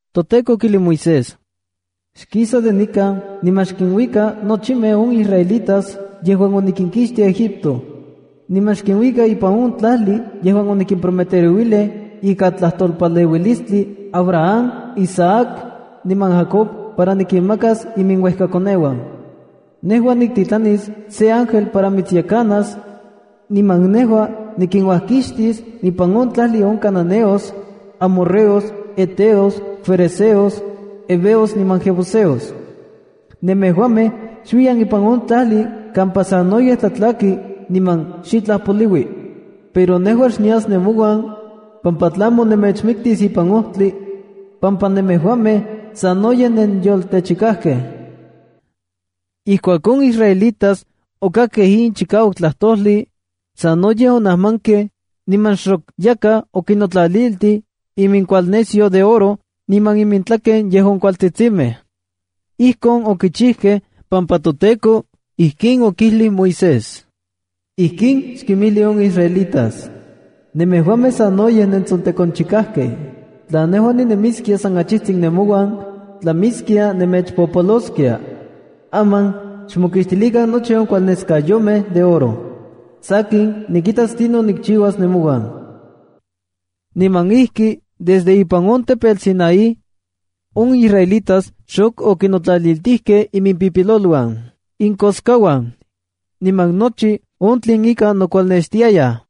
ToTEKO okijlij Moisés: —Xkisa de nikan niman xkinuika nochimej in israelitas yejuan otikinkixtij Egipto, niman xkinuika ipan on tlajli yejuan onikimprometerouilij ika tlajtolpaleuilistli Abraham, Isaac niman Jacob para nikinmakas iminuejkoneuan. Nejua niktitlanis se ángel para mitsyekanas, niman nejua nikinuajkixtis ipan on tlajli on cananeos, amorreos, heteos, ferezeos, heveos niman jebuseos. Nemejuamej xuiyan ipan on tlajli kampa sanoyej tlatlaki niman xitlaj poliui. Pero nejua xnias nemouan, pampa tlamo nemechmiktis ipan ojtli, pampa nemejuamej sanoyej nenyoltechikajkej. Ijkuak on israelitas okakkej in chikauak tlajtojli, sanoyej onajmankej, niman xok yakaj okinotlaliltij iminkualnesyo de oro niman intlaken yejuan kualtsitsimej. Ijkon okichijkej pampa toTEKO ijkin okijlij Moisés: —Ijkin xkinmijli on israelitas: “Nemejuamej sanoyej nentsontekonchikakej. Tla nejua ninemiskia san achijtsin nemouan, tlamiskia nemechpopoloskia. Aman xmokixtilikan nochi on kualneskayomej de oro. Sakin, nikitas tlinon nikchiuas nemouan.” Niman ijki desde ipan on tepetl Sinaía, on israelitas xok okinotlaliltijkej imimpipiloluan, inkoskauan, niman nochi on tlen ika nokualnextiayaj’.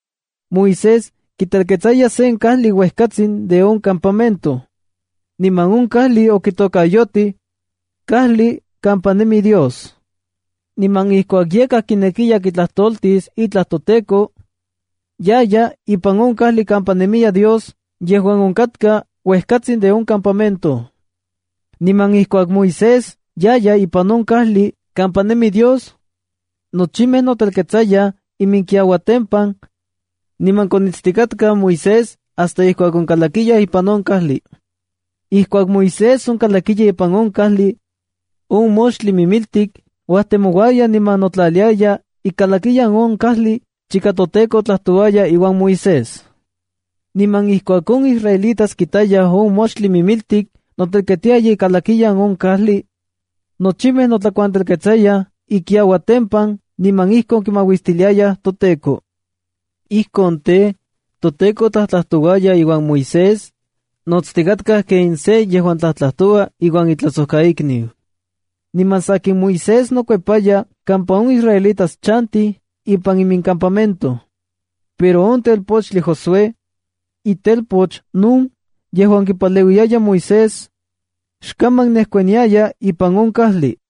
Moisés kitelketsaya sen kajli uejkatsin de on campamento. Niman on kajli okitokayotij “Kajli kampa nemi Dios”. Niman ijkuak yakaj kinekiya kitlajtoltis itlaj toTEKO, yaya ipan on kajli kampa nemi Dios yejuan onkatka uejkatsin de on campamento. Niman ijkuak Moisés yaya ipan on kajli kampa nemi Dios, nochimej notelketsayaj iminkiauatempan, niman konitstikatkaj Moisés hasta ijkuak onkalakiya ipan on kajli. Ijkuak Moisés onkalakiya ipan on kajli, on moxtli mimiltik uajtemouaya niman notlaliaya ikalakiyan on kajli chika toTEKO tlajtouaya iuan Moisés. Niman ijkuak on israelitas kitayaj on moxtli mimiltik noteltiaya ikalakiyan on kajli, nochimej notlakuantelketsayaj inkiuatempan niman ijkon kimauistiliayaj toTEKO. Ijkon tej, toTEKO tlajtlajtouaya iuan Moisés, notstikatka ken se yejuan tlajtlajtoua iuan itlajsojkaikniu. Niman sakin, Moisés nokuepaya kampa on israelitas chantij ipan imincampamento. Pero on telpochtli Josué, itelpoch Nun yejuan kipaleuiyaya Moisés, xkaman nejkuaniaya ipan on kajli.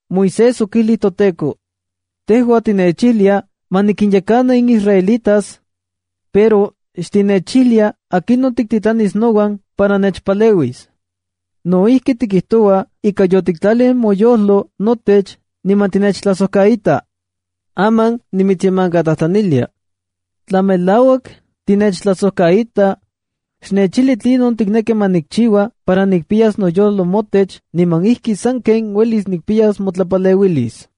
Moisés okijlij toTEKO: —Tejua tinechijlia ma nikinyekana in israelitas, pero xtinechijlia akinon tiktitlanis nouan para nechpaleuis. No ijki, tikijtoua ika yotiktlalij moyojlo notech niman tinechtlajsojkaita. Aman nimitsyemankatlajtlanilia. Tla melauak tinechtlajsojkaita, xnechijli tlinon tikneki ma nikchiua para nikpiyas noyojloj motech niman ijki sanken uelis nikpiyas motlapaleuilis.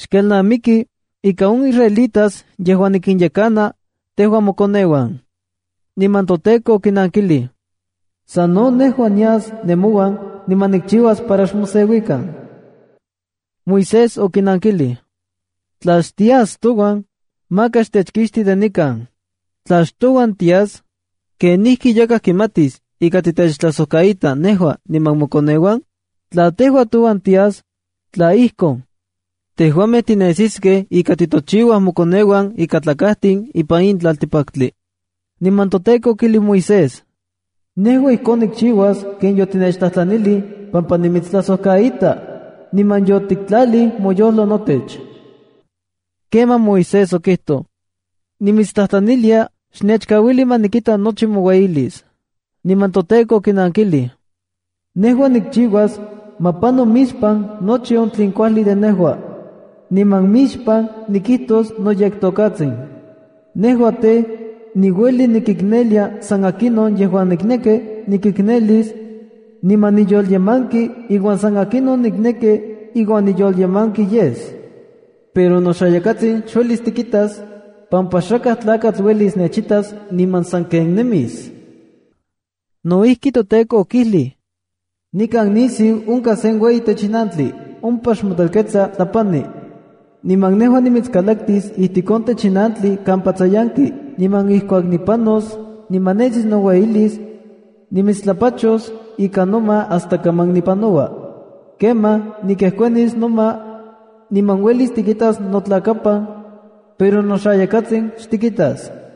Xkelnamiki ika in israelitas yejuan nikinyekana, tejua mokoneuan. Niman toTEKO okinankilij: —San no nejua nias nemouan niman nikchiuas para xmoseuikan. Moisés okinankilij: —Tla xtias touan, maka xtechkixti de nikan. Tla xtouan tias, ¿kenijki yakaj kimatis ika titechtlajsojkaita nejua niman mokoneuan? Tla tejua touan tias, tla ijkon, tejuamej tinesiskej ika titochiuaj mokoneuan ikatlakajtin ipan in tlaltikpaktli. Niman toTEKO okijlij Moisés: —Nejua ijkon nikchiuas ken yotinechtlajtlanilij pampa nimitstlajsojkaita, niman yotiktlalij moyojlo notech. Kemaj Moisés okijtoj: —Nimitstlajtlanilia, xnechkauili ma nikita nochi moueyilis. Niman toTEKO okinankilij: —Nejua nikchiuas ma pano mixpan nochi on tlen kuajli de nejua. Niman mixpan nikijtos noyektokatsin. Nejua tej, niueli nikiknelia san akinon yejuan nikneki nikiknelis, niman niyolyemanki iuan san akinon nikneki iuan niyolyemanki yes. Pero noxayakatsin xuelis tikitas, pampa xakaj tlakatl uelis nechitas niman sanken nemis. No ijki, toTEKO okijlij: —Nikan nisiu onkaj sen ueyi techinantli. Ompa xmotelketsa tlapani. Niman nejua nimitskalaktis ijtik on techinantli kampa tsayanki, niman ijkuak nipanos niman nesis noueyilis, nimitstlapachos ika noma hasta kaman nipanoua. Kemaj nikejkuanis noma, niman uelis tikitas notlakapan, pero noxayakatsin xtikitas.